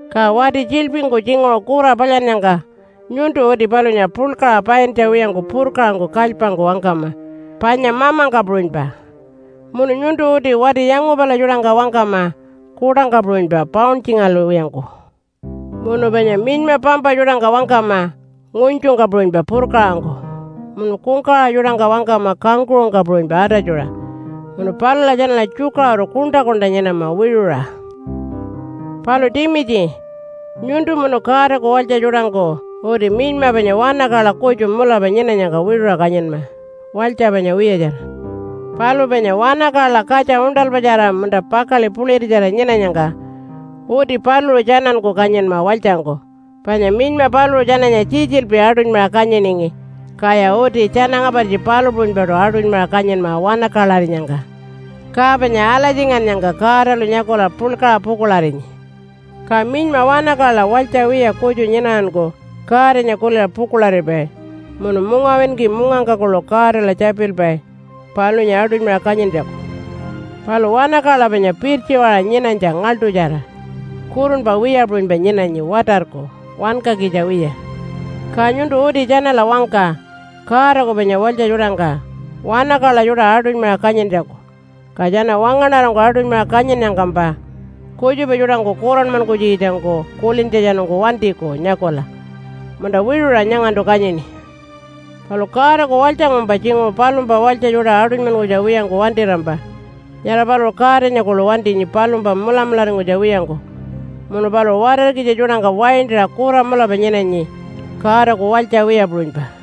Ka wati tjiḻpingku tjinguṟu kura palyannyangka nyuntu uti palunya puḻkaṟa paintja wiyangku purkaṟangku kalypangku wangkama panya mamangka puṟunypa. Munu nyuntu uti wati yangupala tjuṯangka wangkama kuṯangka puṟunypa pauntjingalwiyangku. Munu panya minyma pampa tjuṯangka wangkama ngunytjungka puṟunypa, purkaṟangku. Munu kungkawaṟa tjuṯangka wangkama kangkuṟungka puṟunypa atatjuṟa. Munu palula tjanala tjukaṟuru kuṉṯa-kuṉṯa nyinama wiṟuṟa. Palu Timitji, nyuntu munu Godaku walytja tjuṯangku uti minyma panya wanakaḻa kutju mulapa nyinanyangka wiṟuṟa kanyinma walytja panya wiyatjara. Palu panya wankala katja uṉṯalpatjara munta pakaḻi puḻiritjara nyinanyangka, uti paluṟu tjananku kanyinma walytjangku. Panya minyma paluṟu tjananya tjitjilpi aṯunymaṟa kanyiningi, kaya uti tjana ngapartji palu puṟunypaṯu aṯunymaṟa kanyinma wanakaḻarinyangka. Ka panya alatjingannyangka Godalu nyakula puḻkaṟa pukuḻarinyi. Ka minyma wanakaḻa walytja wiya kutju nyinaranku Godanya kuliṟa pukuḻaripai munu mungawinki mungangka kuḻu Godala tjapilpai palunya aṯunymaṟa kanyintjaku. Palu wanakaḻa panya pirtjiwaṟa nyinanytja ngaḻṯutjara, kurunpa wiya puṟunypa nyinanyi watarku, wankakitja wiya. Ka nyuntu uti tjanala wangka Godaku panya walytja tjuṯangka wanakaḻa tjuṯa aṯunymaṟa kanyintjaku. Ka tjana wangaṉarangku aṯunymaṟa kanyinnyangkampa kutjupa tjuṯangku kuranmankunytjikitjangku kulintjatjanungku wantiku nyakula, “Munta, wiṟuṟa nyangantu kanyini.” Palu Godaku walytjangkumpa tjinguṟu palumpa walytja tjuṯa aṯunymankunytja wiyangku wantirampa, nyara paluṟu Godanya kuḻu wantinyi palumpa mulamularingkunytja wiyangku. Munu paluṟu watarkitja tjuṯangka waintaṟa kura mulapa nyinanyi Godaku walytja wiya puṟunypa.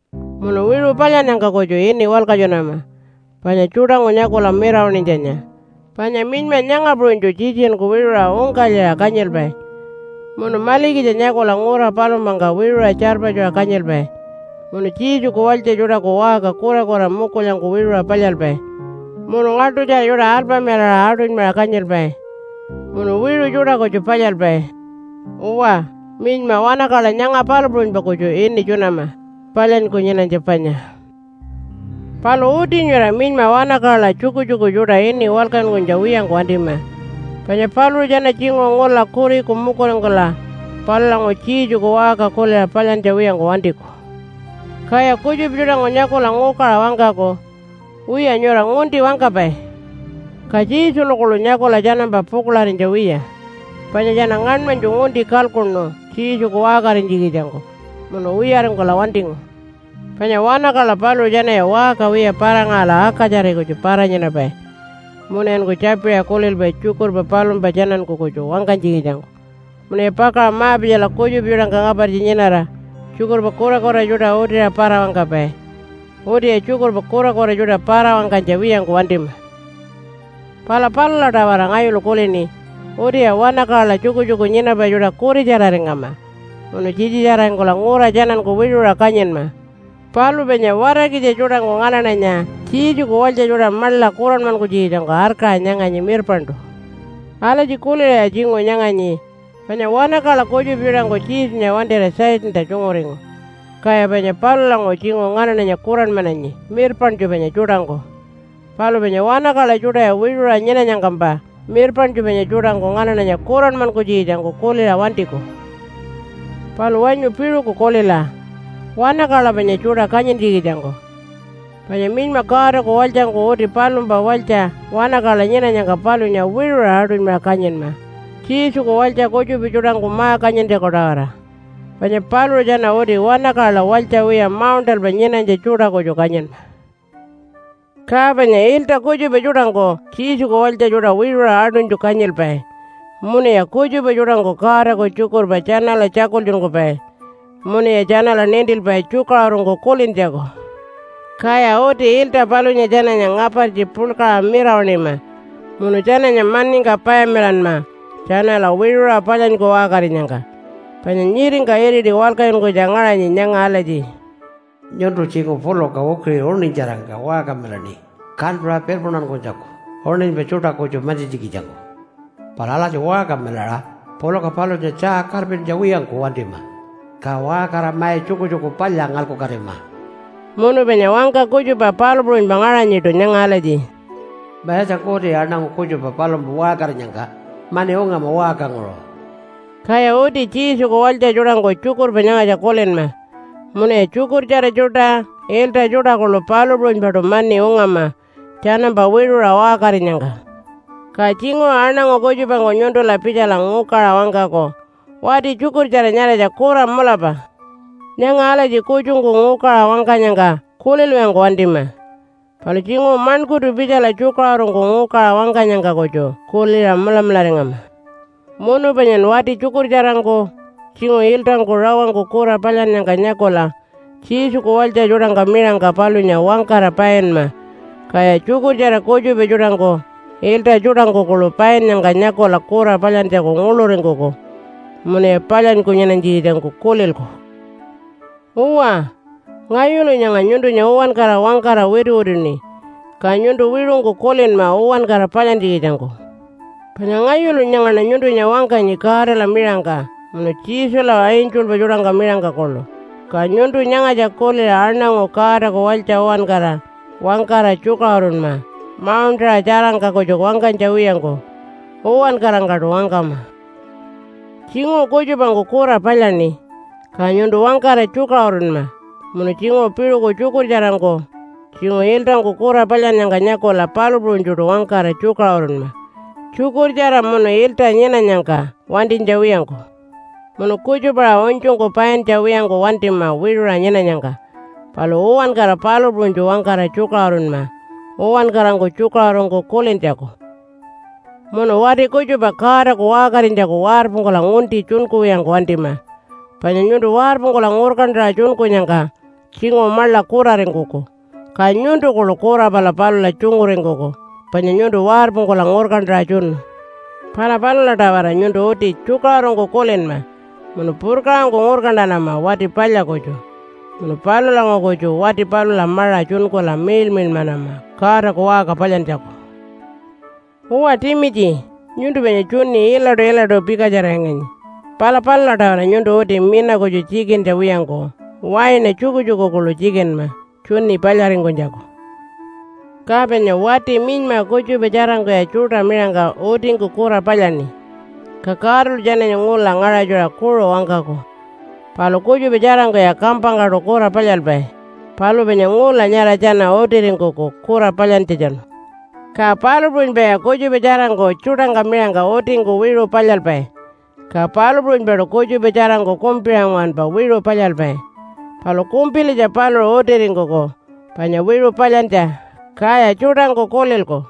Munu wiṟu palyannyangka kutju ini walkatjunama panya tjuṯangku nyakula mirawaṉinytjanya. Panya minyma nyanga puṟunytju tjitjinku wiṟuṟa ungkalyiṟa kanyilpai, munu malikitja nyakula ngura palumpangka wiṟuṟa tjarpatjuṟa kanyilpai, munu Jesuku walytja tjuṯaku waṟka kurakura mukulyangku wiṟuṟa palyalpai, munu ngaḻṯutjara tjuṯa alpamilaṟa aṯunymaṟa kanyilpai, munu wiṟu tjuṯa kutju palyalpai. Uwa, minyma wanakaḻa nyanga palu puṟunypa kutju ini tjunama, palyanyku nyinanytja panya. Palu uti nyura minyma wanakaḻa tjukutjuku tjuṯa ini walkatjunkunytja wiyangku wantima. Panya paluṟu tjana tjinguṟu ngula kuriku mukuringkula palulanguṟu Jesuku waṟka kuliṟa palyantja wiyangku wantiku. Kaya kutjupa tjuṯangku nyakula ngukaṟa wangkaku, “Wiya, nyura ngunti wangkapai!” Ka Jesunya kuḻu nyakula tjanampa pukuḻarinytja wiya. Panya tjana ngaṉmanytju ngunti kalkuṉu Jesuku waṟkarinytjikitjangku, munu wiyaringkula wantingu. Panya wanakaḻa paluṟu tjanaya waṟka wiya para-ngaṟala akatjari kutju para-nyinapai munuyanku tjapiṟa kulilpai tjukurpa palumpa tjananku kutju wangkanytjikitjangku. Munuya pakaṟa ma-pitjala kutjupa tjuṯangka ngapartji nyinara tjukurpa kurakura tjuṯa utiṟa para-wangkapai. Utiya tjukurpa kurakura tjuṯa para-wangkanytja wiyangku wantima. Pala palula-tawara ngayulu kulini utiya wanakaḻa tjukutjuku nyinapai tjuṯa kuritjararingama munu tjitjitjararingkula ngura tjananku wiṟuṟa kanyinma. Palu panya watarkitja tjuṯangku nganaṉanya Jesuku walytja tjuṯa maḻa kuranmankunytjikitjangku arkaṟa nyanganyi mirpaṉṯu. Alatji kuliṟaya tjinguṟu nyanganyi, panya wanakaḻa kutjupa tjuṯangku Jesunya wantira Satanta tjunguringu, kaya panya palulanguṟu tjinguṟu nganaṉanya kuranmananyi mirpaṉtju panya tjuṯangku. Palu panya wanakaḻa tjuṯaya wiṟuṟa nyinanyangkampa mirpaṉtju panya tjuṯangku nganaṉanya kuranmankunytjikitjangku kuliṟa wantiku. Palu wanyu piṟuku kulila wanakaḻa panya tjuṯa kanyintjikitjangku. Panya minyma Godaku walytjangku uti palumpa walytja wanakaḻa nyinanyangka palunya wiṟuṟa aṯunymaṟa kanyinma Jesuku walytja kutjupa tjuṯangku ma-kanyintjaku-tawara. Panya paluṟu tjana uti wanakaḻa walytja wiya mauṉṯalpa nyinanytja tjuṯa kutju kanyinma. Ka panya ilta kutjupa tjuṯangku Jesuku walytja tjuṯa wiṟuṟa aṯunytju kanyilpai, munuya kutjupa tjuṯangku Godaku tjukurpa tjanala tjakultjunkupai munuya tjanala nintilpai tjukaṟurungku kulintjaku. Kaya uti ilta palunya tjananya ngapartji puḻkaṟa mirawaṉima munu tjananya maningka payamilanma tjanala wiṟuṟa palyanyku waṟkarinyangka. Panya nyiringka iriti walkatjunkunytja ngaṟanyi nyanga alatji, “Nyuntu tjinguṟu puluka ukiṟi uṉinytjarangka waṟkamilaṉi kantuṟa pirpuntankunytjaku uṉinypa tjuṯa kutju mantjintjikitjangku. Palu alatji waṟkamilaṟa puluka palunya tjaa karpintja wiyangku wantima, ka waṟkarira mai tjukutjuku palya ngalkukatima.” Munu panya wangka kutjupa palu puṟunypa ngaṟanyiṯu nyanga alatji, “Mayatjangku uti aṉangu kutjupa palumpa waṟkarinyangka mani ungama waṟkanguṟu.” Kaya uti Jesuku walytja tjuṯangku tjukurpa nyangatja kulinma, munuya tjukurtjara tjuṯa, ilta tjuṯa kuḻu palu puṟunypaṯu mani ungama tjanampa wiṟuṟa waṟkarinyangka. Ka tjinguṟu aṉangu kutjupangku nyuntula pitjala ngukaṟa wangkaku, “Wati tjukurtjara nyaratja kura mulapa.” Nyanga alatji kutjungku ngukaṟa wangkanyangka kulilwiyangku wantima. Palu tjinguṟu maṉkurtu pitjala tjukaṟurungku ngukaṟa wangkanyangka kutju kuliṟa mulamularingama. Munu panyan wati tjukurtjarangku, tjinguṟu iltangku, rawangku kura palyannyangka nyakula Jesuku walytja tjuṯangka miṟangka palunya wangkara painma. Kaya tjukurtjara kutjupa tjuṯangku, ilta tjuṯangku kuḻu painnyangka nyakula kura palyantjaku nguḻuringkuku munuya palyanyku nyinanytjikitjangku kulilku. Uwa, ngayulu nyanga nyuntunya uwankara wangkara wituwituṉi. Ka nyuntu wiṟungku kulinma uwankara palyantjikitjangku. Panya ngayulu nyangaṉa nyuntunya wangkanyi Godala miṟangka, munu Jesula angelpa tjuṯangka miṟangka kuḻu. Ka nyuntu nyangatja kuliṟa aṉangu Godaku walytja uwankara wangkara tjukaṟurunma mauṉṯaṟa tjarangka kutju wangkanytja wiyangku, uwankarangkaṯu wangkama. Tjinguṟu kutjupangku kura palyaṉi, ka nyuntu wangkara tjukaṟurunma munun tjinguṟu piṟuku tjukurtjarangku, tjinguṟu iltangku kura palyannyangka nyakula palu puṟunytjuṯu wangkara tjukaṟurunma, tjukurtjara munu ilta nyinanyangka wantinytja wiyangku. Munu kutjupa-aṟa unytjungku paintja wiyangku wantima wiṟuṟa nyinanyangka. Palu uwankara palu puṟunytju wangkara tjukaṟurunma uwankarangku tjukaṟurungku kulintjaku. Munu wati kutjupa Godaku waṟkarinytjaku warpungkula ngunti tjunkuwiyangku wantima. Panya nyuntu warpungkula ngurkantaṟa tjunkunyangka tjinguṟu maḻa kuraringkuku, ka nyuntu kuḻu kura pala palula tjunguringkuku panya nyuntu warpungkula ngurkantaṟa tjunu. Pala palula-tawara nyuntu uti tjukaṟurungku kulinma munu purkaṟangku ngurkantanama wati palya kutju, munu palulanguṟu kutju wati palula maṟa tjunkula miḻmiḻmanama Godaku waṟka palyantjaku. Uwa Timitji, nyuntu panya tjuni ilaṯu-ilaṯu pikatjararinganyi. Pala palula-tawara nyuntu uti mina kutju tjikintja wiyangku waina tjukutjuku kuḻu tjikinma tjuni palyaringkunytjaku. Ka panya wati minyma kutjupa tjarangkuya tjuṯa miṟangka utingku kura palyaṉi. Ka Godalu tjananya ngula ngaṟatjuṟa kuṟu wangkaku. Palu kutjupa tjarangkuya kampangkaṯu kura palyalpai, palu panya ngula nyara tjana utiringkuku kura palyantjatjanu. Ka palu puṟunypaya kutjupa tjarangku tjuṯangka miṟangka utingku wiṟu palyalpai. Ka palu puṟunypaṯu kutjupa tjarangku kumpiṟa nguwanpa wiṟu palyalpai. Palu kumpilitja paluṟu utiringkuku panya wiṟu palyantja, kaya tjuṯangku kulilku.